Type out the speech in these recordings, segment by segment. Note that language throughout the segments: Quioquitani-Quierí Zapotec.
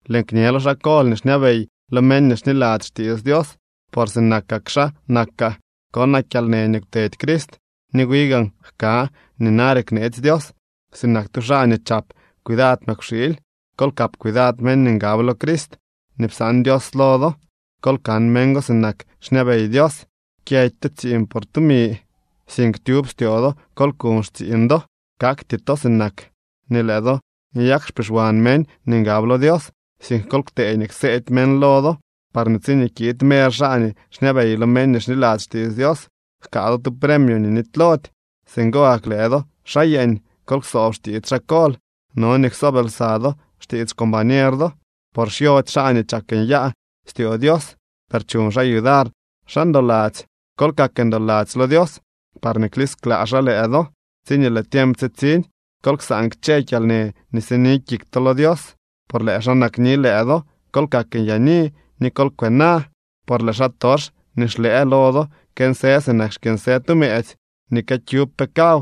Lëën kñe lo xaa kol nii xñabey lo meñ nii xniladzy xtiits Dios, por sinak xaa nakaa. Konaa kyalnë nii kwtedy Crist, ni wi gaan jka nii nare kneetsy Dios. Sinak tu xaa nii chap cuidad mëkwxiily, kol kap cuidad meñ nii ngab lo Crist nii psaan Dios lo do. Kol kan meñ go sinak xñabey Dios. Kyëdy to tsiiñ por tumi, sink tyub styoo do kol kuñ xtsiiñ do. Kakty to sinak nii lëë do nyak xpixwan meñ nii ngab lo Dios, sink kol ktee nii kseedy meñ lo do, parñee tsiñee kiid mer xaa nii xñabey lo meñ nii xniladzy xtiits Dios, jkaa do tu premio nii nitylody. Singo gak lëë do xaa yeeñ kol ksoob xtiits xaa kol. No nii ksoob lsa do xtiits xcombañer do, por xyody xaa nii chak nyaa styoo Dios, per chuñ xaa yudar xaa ndoladzy. Kol kak ndoladzy lo Dios, parñee klisklaa xaa lëë do tsiñee lëë tiemp tsitsiñ. Kol ksaan kchë kyalnë nii sini kik to lo Dios, por lëë xaa nakni lëë do. Kol kak nyaani ni kol kwena, por lëë xaatox nii xlëë lo do kënsë sinak xkyënsë tu mëëtsy nii këkyub pe kaw.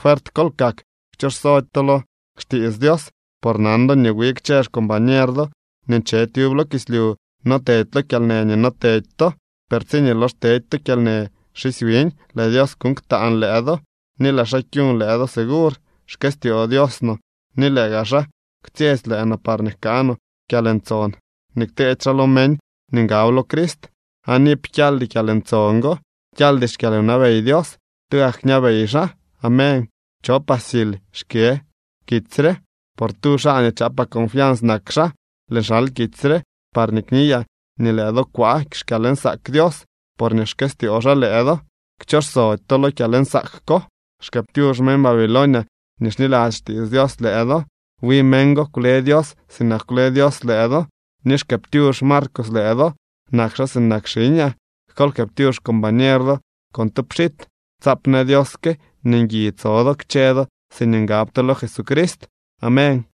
Fuert kol kak, kchooxsody to lo xtiits Dios, por nan do nii wi kchë xcombañer do nii nche tyub lo kislyu no tedy lo kyalnë nii no tedy to. Per tsiñee lox tedy to kyalnë xisy wiñ, lëë Dios kuñ ktaan lëë do ni lëë xaa kyuñ lëë do segur. Xkëstyoo Dios no ni lëë gaa xaa kwtsyetsy lëë no parñee jkaa no kyalntson nii kteedy xaa lo meñ nii ngab lo Crist, aan iip kyaldy kyalntson go. Kyaldy xkyalwnabey Dios. Tugak kñabey xaa. Amén. Chopaa Sil xkë kitsy re, por tu xaa nii chaapaa confians nak xaa. Lëën xal kitsy re parñee kniyaa nii lëë do kwaa xkyalnsaak Dios, porñee xkëstyoo xaa lëë do. Kchooxsody to lo kyalnsaak ko. Xkëëptyux meñ Babilonia nii xniladzy xtiits Dios lëë do. Wi meñ go kwle Dios sinak kwle Dios lëë do. Ni xkëëptyux Marcos lëë do. Nak xaa sinak xiñaa. Kol jkëëptyux xcombañer do con tu pxit. Tsaap në Dios que nii ngui tso do kchë do siñee ngab to lo Jesucrist. Amén.